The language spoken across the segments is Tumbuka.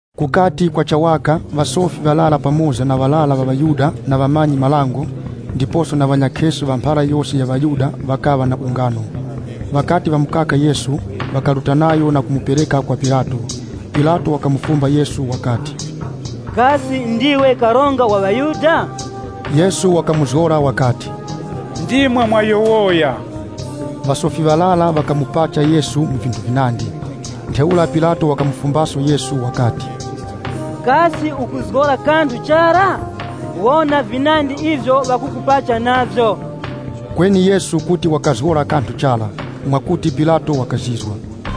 Kukati kwacha waka, ŵasofi ŵarara pamoza na ŵarara ŵa ŵaYuda na ŵamanyi-marango, ndiposo na ŵanyakheso ŵa mphara yose ya ŵaYuda ŵakaŵa na ungano. Ŵakati ŵamukaka Yesu, ŵakaruta nayo na kumupereka kwa Pilato. Pilato wakamufumba Yesu wakati, “Kasi ndiwe Karonga wa ŵaYuda?” Yesu wakamuzgora wakati, “Ndimwe mwayowoya.” Ŵasofi ŵarara ŵakamupacha Yesu mu vinthu vinandi. Ntheura Pilato wakamufumbaso Yesu wakati, “Kasi ukuzgora kanthu chara? Wona vinandi ivyo ŵakukupacha navyo!” Kweni Yesu kuti wakazgora kanthu chara, mwakuti Pilato wakazizwa.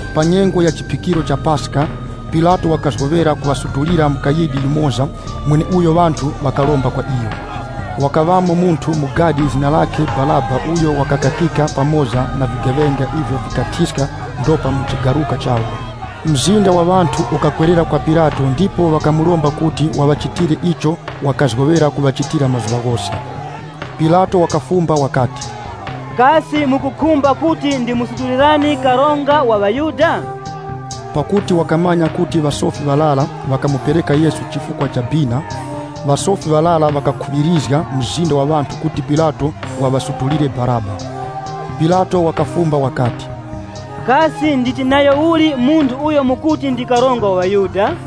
Pa nyengo ya chiphikiro cha Paska, Pilato wakazgoŵera kuŵasutulira mukayidi yumoza mweneuyo ŵanthu ŵakaromba kwa iyo. Wakaŵamo munthu mu gadi zina lakhe Baraba uyo ŵakakakika pamoza na vigeŵenga ivyo vikathiska ndopa mu chigaruka chawo. Mzinda wa ŵanthu ukakwerera kwa Pilato ndipo ŵakamuromba kuti waŵachitire icho wakazgoŵera kuŵachitira mazuŵa ghose. Pilato wakafumba wakati, “Kasi mukukhumba kuti ndimusutulirani Karonga wa ŵaYuda?” Pakuti wakamanya kuti ŵasofi ŵarara ŵakamupereka Yesu chifukwa cha bina. Ŵasofi ŵarara ŵakakhuŵirizga mzinda wa ŵanthu kuti Pilato waŵasutulire Baraba. Pilato wakafumba wakati, “Kasi nditi nayo uli munthu uyo mukuti ndi Karonga wa ŵaYuda?”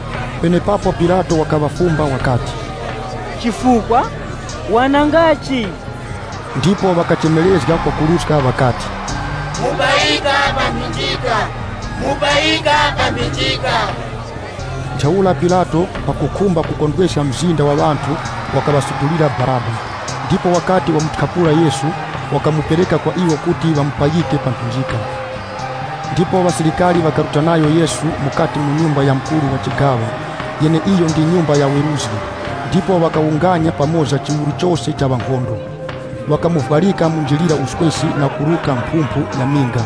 Penepapo Pilato wakaŵafumba wakati, “Chifukwa? Wanangachi?” Ndipo ŵakachemerezga kwakuruska ŵakati, “Mupayika pa mphinjika!” Ntheura Pilato, pakukhumba kukondweska mzinda wa ŵanthu wakaŵasutulira Baraba, ndipo wakati wamuthyapula Yesu, wakamupereka kwa iwo kuti ŵamupayike pa mphinjika. Ndipo ŵasilikari ŵakaruta nayo Yesu mukati mu nyumba ya mukuru wa chigaŵa, yeneiyo ndi nyumba ya weruzgi, ndipo ŵakawunganya pamoza chiwuru chose cha ŵa nkhondo. Ŵakamuvwarika munjilira uswesi na kuruka mphumphu ya minga,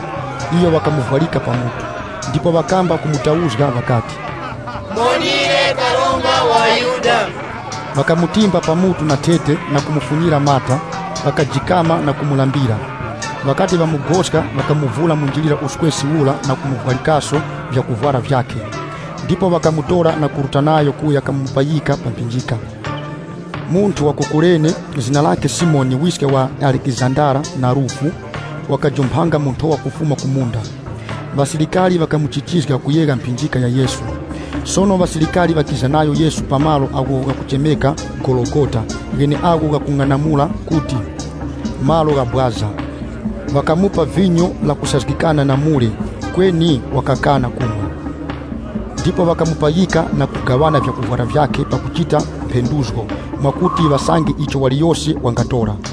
iyo ŵakamuvwarika pa mutu. Ndipo ŵakamba kumutauzga ŵakati, “Muwonire Karonga wa ŵaYuda!” Ŵakamutimba pa mutu na thete na kumufunyira mata, ŵakajikama na kumulambira. Ŵakati ŵamugoska ŵakamuvura munjilira uswesi ura na kumuvwarikaso vyakuvwara vyakhe. Ndipo ŵakamutora na kuruta nayo kuya kamupayika pa mphinjika. Munthu wa ku Kurene zina lakhe Simoni wiske wa Alekizandara na Rufu, wakajumphanga mu nthowa kufuma ku munda. Ŵasilikari ŵakamuchichizga kuyegha mphinjika ya Yesu. Sono ŵasilikari ŵakiza nayo Yesu pa malo agho ghakuchemeka Gologota gheneagho ghakung'anamula kuti, “Malo gha Bwaza.” Ŵakamupa vinyo lakusazgikana na mure, kweni wakakana kumwa. Ndipo ŵakamupayika na kugaŵana vyakuvwara vyakhe pakuchita mphenduzgo mwakuti ŵasange icho waliyose wangatora.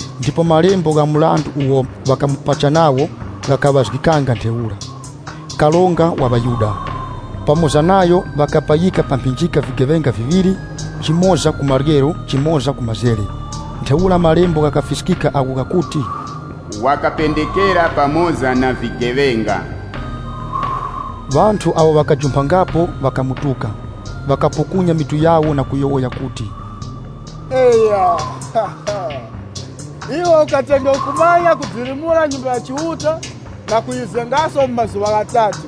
Ndipo malembo gha mrandu uwo ŵakamupacha nawo ghakaŵazgikanga ntheura, “Karonga wa ŵaYuda.” Pamoza nayo ŵakapayika pa mphinjika vigeŵenga viŵiri, yumoza ku maryero yumoza ku mazere. [ Ntheura Malembo ghakafiskika agho ghakuti, “Wakapendekera pamoza na vigeŵenga.”] Ŵanthu awo ŵakajumphangapo ŵakamutuka, ŵakapukunya mitu yawo na kuyowoya kuti, “Eya! Iwe ukatenge ukumanya kudilimura Nyumba ya Chiuta na kuyizengaso mu mazuŵa ghatatu.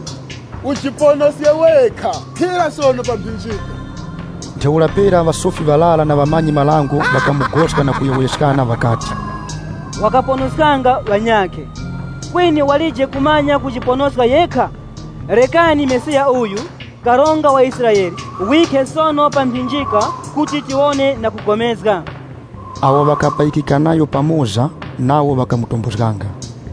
Ujiponoske wekha, khira sono pa mphinjika!” Ntheura pera ŵasofi ŵarara na ŵamanyi-marango ŵakamugoska na kuyowoyeskana ŵakati, “Wakaponoskanga ŵanyakhe, kweni walije kumanya kujiponoska yekha! Rekani Mesiya uyu, Karonga wa Israele, wikhe sono pa mphinjika kuti tiwone na kupulikana.” Awo ŵakapayikika nayo pamoza nawo ŵakamutombozganga.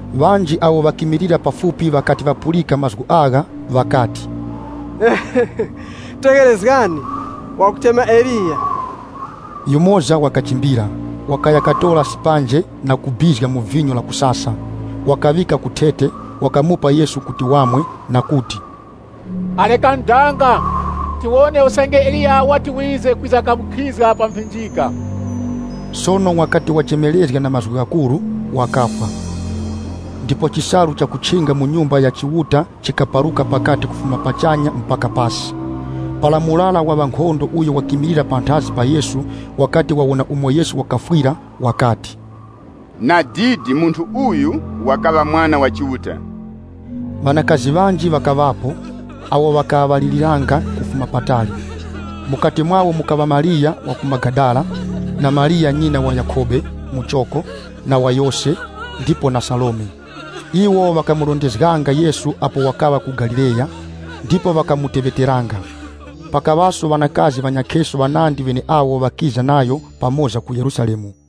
Ŵanji awo ŵakimilira pafupi ŵakati ŵapulika mazgu agha, ŵakati, “Tegherezgani, wakuchema Eliya.” Yumoza ŵakachimbira, wakaya katora sipanje na kubizga mu vinyo la kusasa, wakaŵika ku thete, wakamupa Yesu kuti wamwe, na kuti, “Rekani danga! Tiwone usange Eliya wati wize, kwiza kamukhizga pa mphinjika!” Sono wakati wachemerezga na mazgu ghakuru, wakafwa. Ndipo chisalu chakuchinga mu Nyumba ya Chiuta chikaparuka pakati kufuma pachanya mpaka pasi. Para murara wa ŵankhondo uyo wakimilira panthazi pa Yesu, wakati wawona umo Yesu wakafwira wakati, “Nadidi munthu uyu wakaŵa Mwana wa Chiuta!” Ŵanakazi ŵanji ŵakaŵapo, awo ŵakalaŵiriranga kufuma patali. Mukati mwawo mukaŵa Mariya wa ku chigaŵa cha Magadala, Mariya nyina wa Yakhobe muchoko, Mariya nyina wa Yose, ndiposo na Salome. Ŵanakazi aŵa ŵakendanga nayo Yesu apo wakaŵa ku Galileya, ndipo ŵakamuteŵeteranga. Pakaŵaso ŵanakazi ŵanyakheso ŵanandi ŵeneawo ŵakiza nayo pamoza ku Yerusalemu.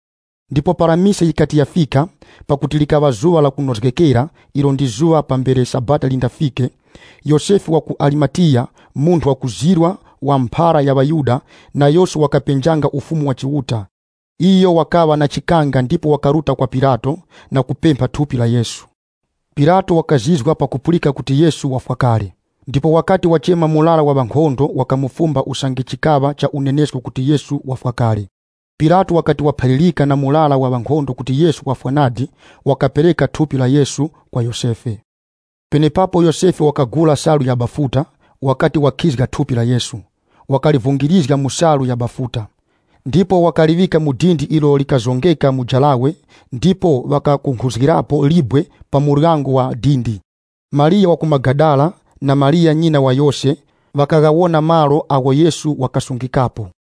Ndipo para mise yikati yafika, pakuti likaŵa zuŵa la kunozgekera, ilo ndi zuŵa pambere Sabata lindafike, Yosefe wa ku Arimatiya, munthu wakuzirwa wa mphara yikuru ya ŵaYuda, nayoso wakapenjanga Ufumu wa Chiuta Iyo wakaŵa na chikanga ndipo wakaruta kwa Pilato, na kupempha thupi la Yesu. Pilato wakazizwa pakupulika kuti Yesu wafwa kale. Ndipo wakati wachema murara wa ŵankhondo wakamufumba usange chikaŵa cha unenesko kuti Yesu wafwa kale. Pilato wakati waphalirika na murara wa ŵankhondo kuti Yesu wafwa nadi, wakapereka thupi la Yesu kwa Yosefe. Penepapo Yosefe wakagula salu ya bafuta, wakati wakhizga thupi la Yesu, wakalivungirizga mu salu ya bafuta. Ndipo wakaliŵika mu dindi ilo likazongeka mu jarawe ndipo ŵakakunkhuzgirapo libwe pa muryango wa dindi. Mariya wa ku Magadala, na Mariya nyina wa Yose, ŵakaghawona malo agho Yesu wakasungikapo.